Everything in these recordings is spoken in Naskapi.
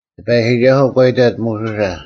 ᑎᐸᔨᒋᒐᓱᐤ ᒂ ᐃᑕᑦ ᒧᓱᓴ,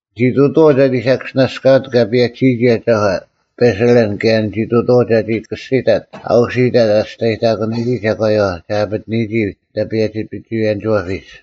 ᓂᒋ ᑐᑐᐛᐤ ᒐᒋ ᓴᑭᔅᒋᓇᔅᑲᑯᑦ ᑲ ᐸᔭᒋᓯᔨᒋ ᐊᒐᒂ ᐸᓴᓕᓪ ᑭᔭ ᓂᒋ ᑐᑐᐛᐤ ᒐᒋ ᑭᔅᒋᑕᑦ ᐊ ᐅᓯᑕᑦ ᐊ ᒋᔅᑕᔨᑕᑯᓂᔨᒋ ᒐᒂᔪᐛ ᒐ ᐊᐱᑎᓂᔨᒋ ᐊᓐᑕ ᐸᔭᒋ ᐱᒍᐎᔭᓂᒋᐛᐱᒡ᙮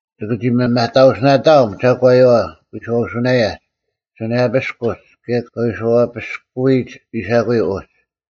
ᒋᑭ ᒋ ᒥᒪᑕᐅᓯᓇᑕᐊᒻ ᒐᒂᔪᐛ ᐎᔄᐅᓱᓇᔭᒡ, ᓱᓇᔭᐱᔅᑯᒡ ᑭᔭ ᑲ ᐎᔄᐛᐱᔅᑯᔨᒡ ᐃᓴᑯᔪᐤ ᐅᒡ᙮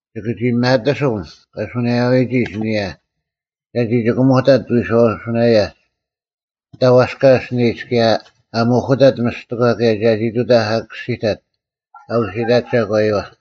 ᒋᑭ ᒋ ᒪᑎᓱᒻ ᑲ ᓱᓇᔭᐎᔨᒋ ᐊᓯᓂᔭ ᒐᒋ ᒋᑭᒧᑕᑦ ᐎᔄᐅᓱᓇᔭᒡ ᐊᓐᑕ ᐛᔅᑲ ᐊᓯᓂᒡ ᑭᔭ ᐊ ᒧᐧᑯᑕᑦ ᒥᔅᑎᒂ ᑭᔭ ᒐᒋ ᑐᑕᐧᒄ ᐊᑭᔅᒋᑕᑦ ᐊᐅᓯᑕᑦ ᒐᒂᔪᐛ᙮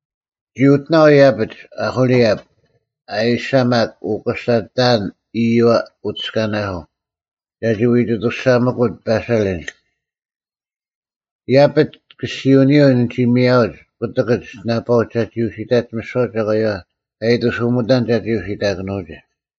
ᓂᒋ ᐅᑎᓇᐤ ᐃᔭᐱᒡ ᐅᐦᐅᓕᐊᑉ, ᐊᐦᐃᓴᒪᒃ ᐅᑯᓴ ᑕᐊᓐ ᐃᔪᐛ ᐅᑎᔅᑲᓇᓱᐤ ᒐᒋ ᐎᒋ ᐊᑐᔅᒐᒥᑯᑦ ᐸᓴᓚᓪ᙮ ᐃᔭᐱᒡ ᑭᔅᒋᐅᓂᔪᐤ ᓂᒋ ᒥᔭᐅᒡ ᑯᑎᑭᒡ ᓇᐸᐅᒡ ᒐᒋ ᐅᓯᑕᒡ ᒥᓯᐛ ᒐᒂᔪᐛ ᑲ ᐃᑎᓱᒥᑕᓐ ᒐᒋ ᐅᓯᑕᑭᓄᐅᒋ᙮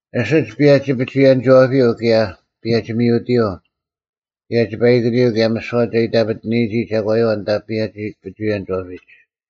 ᐊᓯᒡ ᐸᔭᒋ ᐱᒍᐎᔭᓂᒋᐛᐱᔪᐤ ᑭᔭ ᐸᔭᒋ-ᒥᐅᑎᔪᐤ ᑭᔭ ᒋᐸᐃᑭᓂᔪᐤ ᑭᔭ ᒥᓯᐛ ᒐ ᐃᑕᐱᑎᓂᔨᒋ ᒐᒂᔪᐛ ᐊᓐᑕ ᐸᔭᒋ ᐱᒍᐎᔭᓂᒋᐛᐱᒡ,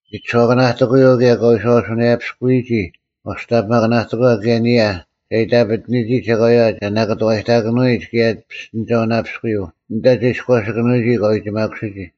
ᒥᒋᓱᐛᑭᓇᑎᑯᔪᐤ ᑭᔭ ᑲ ᐎᔄᐅᓱᓇᔭᐱᔅᑯᔨᒋ ᐛᔅᑕᓂᐱᒪᑭᓇᑎᒂ ᑭᔭ ᐊᓂᔭ ᒐ ᐃᑕᐱᑎᓂᔨᒋ ᒐᒂᔪᐛ ᒐ ᓇᑭᑐᐛᔨᑎᑭᓄᐎᔨᒡ ᑭᔭ ᐱᔅᑎᓂᒐᐅᓇᐱᔅᑯᔪᐤ ᐊᓐᑕ ᒐ ᐃᔎᓴᑭᓄᐎᔨᒋ ᑲ ᐎᒋᒪᑯᓯᔨᒋ᙮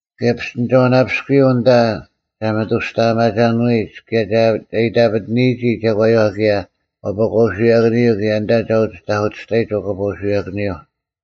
ᑭᔭ ᐱᔅᑎᓂᒐᐅᓇᐱᔅᑯᔪᐤ ᐊᓐᑕ ᒐ ᒥᑐᔅᑕᐊᒪᒐᓄᐎᔨᒡ ᑭᔭ ᒐ ᐃᑕᐱᑎᓂᔨᒋ ᒐᒂᔪᐛ ᑭᔭ ᐛᐸᑲᐅᓱᔭᑭᓂᔪᐤ ᑭᔭ ᐊᓐᑕ ᒐ ᐅᒋ ᑕᐧᑯᑎᔅᑕᔨᒡ ᐛᐸᑲᐅᓱᔭᑭᓂᔪᐤ᙮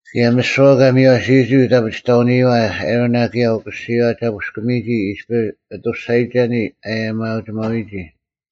ᑭᔭ ᒥᓯᐛ ᑲ ᒥᔽᓯᔨᒋ ᐅᑦ ᐊᔭᒥᐊᐅ-ᐊᐱᒋᑕᐅᓂᔨᐛ ᐊᕋᓇ ᑭᔭ ᐅᑯᓯᔨᐛ ᒐ ᐳᔅᑲᒥᔨᒋ ᐃᔅᐱ ᐊᑐᔅᒐᔨᒐᓂ ᐊᔭᒥᐊᐅᒋᒪᐅᐎᔨᒋ᙮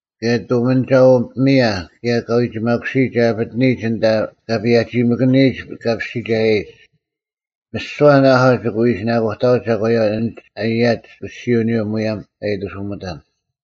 ᑭᔭ ᑐᒥᓂᒐᐅ-ᐱᒥᔭ ᑭᔭ ᑲᐎᒋᒪᑯᓯᒡ ᒐ ᐊᐱᑎᓂᔨᒡ ᐊᓐᑕ ᑲ ᐸᔭᒋᒥᑭᓂᔨᒡ ᑲᐱᔅᒋᒐᔭᔨᒡ᙮ ᒥᓯᐛ ᓇᐊᐤ ᒋᑭ ᐎ ᐃᓯᓇᑯᑕᐅᒡ ᒐᒂᔪᐛ ᐊᓐᒡ ᐊᔭᒡ ᑭᔅᒋᐅᓂᔪᐤ ᒧᔭᒻ ᑲ ᐃᑎᓱᒥᑕᓐ᙮”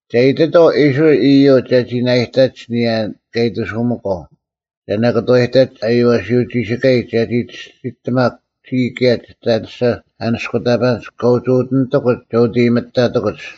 “ᒐ ᐃᑎᑥᐤ ᐃᔅᕋᐃᓪ ᐃᔪᒡ ᒐᒋ ᓇᐃᑕᒡ ᐊᓂᔭ ᑲ ᐃᑐᓱᒥᒂᐤ ᒐ ᓇᑭᑐᐛᔨᑕᒡ ᐊᔽᓯᐅᒋᓯᑲᔨᒡ ᒐᒋ ᒋᔅᒋᑎᒪᒄ ᒋᔾ ᑭᔭ ᒋᑦ ᐊᔭᓂᔅᒐ ᐊᓂᔅᑯᑕᐸᓐᒡ ᑲᒋ ᐅᑎᓂᑎᑯᒡ ᒐ ᐅᑦ ᐃᔨᒥᑕᑎᑯᒡ᙮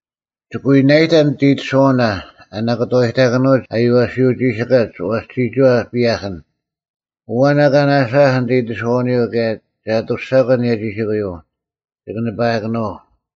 ᒋᑭ ᐎ ᓇᐃᑕᓐ ᓂᑦ ᐃᑎᓱᐛᐅᓇ ᐊ ᓇᑭᑐᐛᔨᑕᑭᓄᐅᒡ ᐊᔽᓯᐅᒋᓯᑲᒡ ᐛᔅ ᒋᒋᐛ ᐸᔭᐧᑭᓐ᙮ ᐊᐛᓐ ᐊᑲ ᓇᓴᐊᐧᒃ ᓂᑦ ᐃᑎᓱᐛᓂᔪᐤ ᑭᔭ ᒐ ᐊᑐᔅᒐᒂ ᐊᓂᔭ ᒋᓯᑯᔪᐤ, ᒋᑭ ᓂᐸᐊᑭᓄᐤ᙮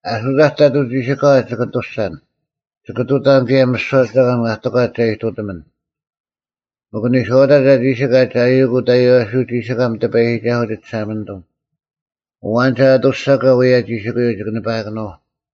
ᐊᓱᑕᒡ ᑕᑐᐤ ᒋᓯᑲᐛ ᒋᑭ ᐊᑐᔅᒐᓐ, ᒋᑭ ᑐᑕᓐ ᑭᔭ ᒥᓯᐛ ᒐᒂᓐ ᐊ ᑎᒂᒡ ᒐ ᐃᑐᑎᒥᓐ, ᒥᒄ ᓂᔄᐅᑕᒡ ᐊ ᒋᓯᑲᒡ ᐊᔪᐅᒄ ᐅᑦ ᐊᔽᓯᐅᒋᓯᑲᒻ ᑎᐸᔨᒋᒐᓱᐤ ᒋ ᒋᓴᒪᓂᑐᒻ, ᐊᐛᓐ ᒐ ᐊᑐᔅᒐᒂ ᐅᔭ ᒋᓯᑯᔪᐤ ᒋᑭ ᓂᐸᐊᑭᓄᐤ᙮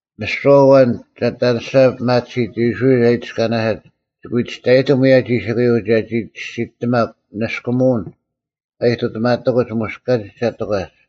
ᒥᓯᐛ ᐊᐛᓐ ᒐ ᐊᑎ ᐊᓂᔅᒐ ᐱᒪᑎᓯᑦ ᐃᔅᕋᐃᓪ ᐊ ᐃᑎᔅᑲᓇᓯᑦ ᒋᑭ ᐎ ᒋᔅᑕᔨᑎᒻ ᐅᔭ ᒋᓯᑯᔪᐤ ᒐᒋ ᒋᔅᒋᑎᒪᒄ ᓂᔅᑯᒧᐅᓐ ᑲ ᐃᑐᑎᒪᑎᑯᒡ ᒧᔅ ᑲᒋᒡ ᒐ ᑎᒂᒡ᙮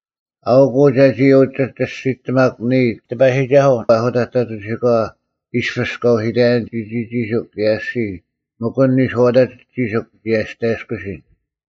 ᐊᐅᒄ ᐅ ᒐᒋ ᐅᒋ ᒋᔅᒋᑎᒪᒄ ᓂᔾ ᑎᐸᔨᒋᒐᓱᐤ ᐊᓱᑕᒡ ᑕᑐᐤ ᒋᓯᑲᐛ ᐃᔅᐱᔅ ᑲ ᐅᓯᑕᔭᓐ ᒋᒋᒋᓯᒄ ᑭᔭ ᐊᔅᒋᔾ ᒥᒄ ᐊᓐ ᓂᔄᐅᑕᒡ ᒋᓯᒄ ᓂᒋ ᐊᔅᑕᔭᔅᑯᓯᓐ᙮”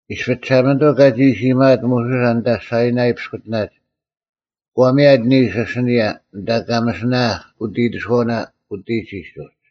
ᐃᔅᐱ ᒋᓴᒪᓂᑐᐤ ᑲᒋ ᐃᓯ ᐃᔨᒪᐊᑦ ᒧᓱᓴ ᐊᓐᑕ ᓴᐃᓇᐃ ᐱᔅᑯᑎᓇᒡ᙮ ᒂ ᒥᔭᑦ ᓂᓱ ᐊᓯᓂᔭ ᐊᓐᑕ ᑲ ᒥᓯᓇᐊᐧᒃ ᐅᑦ ᐃᑎᓱᐛᐅᓇ ᐅᑎᒋᒡ ᐅᒡ᙮